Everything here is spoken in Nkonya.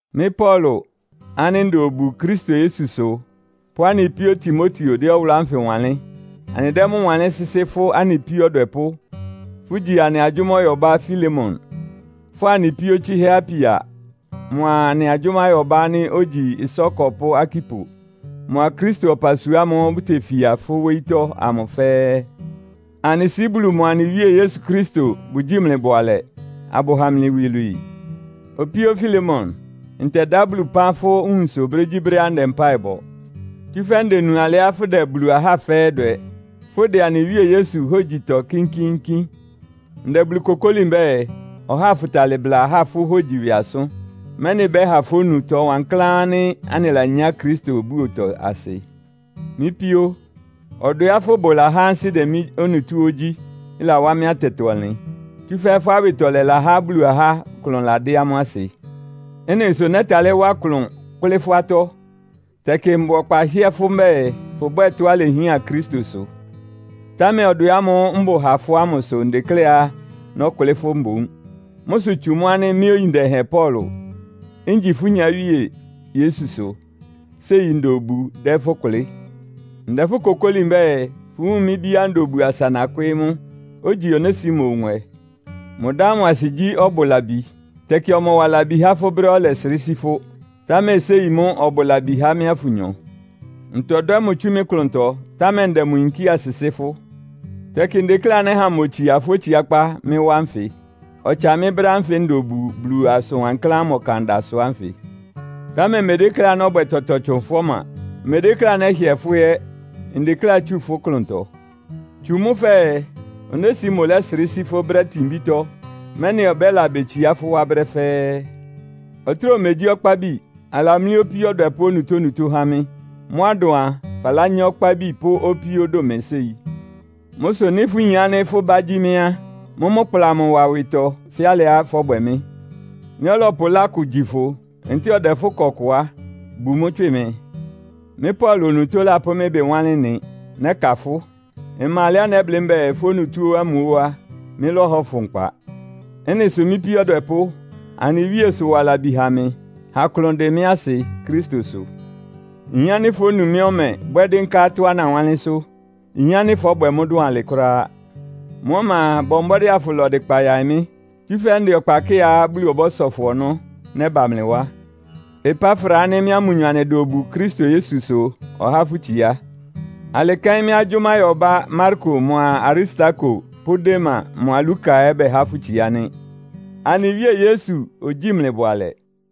Mɩ́ Paulo ánɩ́ nda obu Kristo Yesu sʋ pʋ́ anɩ píó Timoteo dɛ́ ɔwʋlʋ́ ánfɩ wanlɩ́n. Anɩdɛ́ mʋ́ wanlɩ́n sɩ́sɩ́ fʋ́ anɩ píó ɔdwɛpʋ́, fʋ́gyi anɩ agyʋ́máyɔbá Filemon, fʋ́a anɩ píó tsɩ́hɛ́ Apia mʋa anɩ agyʋ́máyɔbá ánɩ́ ogyi ɩsá ɔkɔpʋ́ Arkipo mʋa Kristo ɔpasua ámʋ́ʋ́ bʋtefia fʋ́ wóyítɔ́ amʋ fɛ́ɛ́. Anɩ Sɩ́ Bulu mʋa anɩ Wíe Yesu Kristo bʋgyíi mlɩ bʋalɛ, abʋha mlɩ iwilwii. Opíó Filemon, ntɛdá Bulu ɩpán fʋ́ nwunsʋ brégyíbrɛ́á ndɛ mpáɩ bɔ. Tsúfɛ́ ndenu alɩá fʋdɛ Bulu ahá fɛ́ɛ́ dwɛ, fʋ́dɛ anɩ Wíe Yesu hógyitɔ kínkíínkín. Ndɛ Bulu kokóli mbɛ́ɛ, ɔháa afʋtalɩ bla ahá fʋ́ hógyi ɩwɩ asʋ́n, mɛ́nɩ ɩbɛ́ha fónu ɩtɔ wankláán ánɩ́ anɩlanyá Kristo búotɔ asɩ. Mɩ́ píó, ɔdwɛá fʋ́bʋ lahá ansɩ́ dɛ mɩ́ onutó óó gyí, ɩlawá mɩ́ atɛtɔ-ɔnlɩn. Tsúfɛ́ fʋ́ awɩtɔlɛ lahá Bulu ahá klʋn ladɩ́ amʋ́ asɩ. Ɩ́nɩ sʋ nɛ́talɩ́ wá klʋn kʋ́lɩ́ fʋ́ atɔ́. Tɛkɩ mbʋ ɔkpa hɩ́ɛ́ fʋ́ mbɛ́ɛ, fʋbwɛ́ɛ tɔ́á ilehián Kristo sʋ. Támɛ ɔdwɛ ámʋ́ʋ́ mbʋ ha fʋ́ ámʋ sʋ ndekléá nɔ́kʋlɩ́ fʋ́ mboún. Mʋ́ sʋ tsu mʋ́ ánɩ́ mɩ́ oyin dɛhɛn Paulo, ngyi fʋ́ nyáwíe Yesu sʋ, séi nda obu dɛ́ fʋ́ kʋlɩ́. Ndɛ fʋ́ kokóli mbɛ́ɛ, fʋwúun mɩ́ bíá nda obu asa nakwɩ́ɩ́ mʋ, ogyi Onesimo nwɛ. Mʋ dá ámʋ asɩ gyí ɔbʋ labi. Tɛkɩ ɔmɔwa labi há fʋ́ brɛ́á ɔlɛsrɩ́ sí fʋ́, támɛ séi mʋ́ ɔbʋ labi há mɩ́a fʋnyɔ. Ntɔdwɛ́ mʋ tsú mɩ́ klʋntɔ, támɛ ndɛ mʋ yinkía sɩsɩ́ fʋ́. Tɛkɩ ndekléá nɛ́ha mʋ otsia fʋ́ otsiákpá mɩ́ wá nfɩ, ɔtsa mɩ́ brɛ́ ánfɩ nda obu Bulu asʋn wankláán ámʋ ɔkan da sʋ ánfɩ. Támɛ mmedékléá nɔ́bwɛ tɔtɔ tsʋn fʋ́ ɔma. Mmedékléá nɛ́hɩɛ fʋ́ ɛ́. Ndekléá itsu fʋ́ klʋntɔ. Tsu mʋ́ fɛɛ, Onesimo lɛ́srɩ́ sí fʋ́ brɛ́ itinbítɔ́, mɛ́nɩ ɔbɛ́la betsiá fʋ́ wá brɛ́ fɛ́ɛ́. Ɔtráa omegyí ɔkpábi. Alamlí opíó ɔdwɛpʋ́ onutónutó há mɩ́. Mʋ́á ɩdʋn a, falányá ɔkpábi pʋ́ opíó dʋn mɩ séi. Mʋ́ sʋ nɩ́ fʋyin ánɩ́ fʋ́ bá gyí mɩ́ á, mʋ́mʋ́ kpla mʋ wa ɩwɩtɔ fɛ́ alɩá fɔ́bwɛ mɩ́. Nɩ́ ɔlɔpʋ ɩlá kʋ gyi fʋ, ntɛ́ɛ ɔdɛ fʋ́ ɩkɔ kʋ á, bu mʋ́ tswɩ mɩ. Mɩ́ Paulo onutó lapʋ́ mɩ́ ɩbɩ wanlɩ́n ɩ́nɩ, “Nɛ́ka fʋ́.” (Ɩma alɛá nɛ́blɩ́ mbɛ́ɛ, fʋ́ onutó ámʋ óó á, mɩ́lɔ́hɔ fʋ nkpa.) Ɩ́nɩ sʋ mɩ́ píó ɔdwɛpʋ́, anɩ Wíe sʋ wa labi ha mɩ. Ha klʋn ɩdɩ mɩ́ asɩ Kristo sʋ. Nyin ánɩ́ fónu mɩ́ ɔmɛ bwɛ́ dɩ́nká tɔ́á nawánlɩ́nsʋ́. Nyin ánɩ́ fɔ́bwɛ mʋ́ dʋn alɩ kʋ́ráá. Mʋ́ ɔma a, bɔ mbɔ́dɩ́ afʋla ɔdɩkpa yaɩ mɩ́, tsúfɛ́ ndɛ ɔkpa kɩ́ɩá Bulu ɔbɔ́sɔ fʋ ɔnɔ́, nɛ́ba mlɩ wá. Epafra ánɩ́ mɩ́a mʋnyɔ anɩda obu Kristo Yesu sʋ ɔhá fʋ́ itsiá. Alɩ kɛ́n mɩ́ agyʋ́máyɔbá Marko mʋa Aristarko pʋ́ Dema mʋa Luka ɛ́ bɛhá fʋ́ itsiá nɩ́. Anɩ Wíe Yesu ogyíi mlɩ bʋalɛ.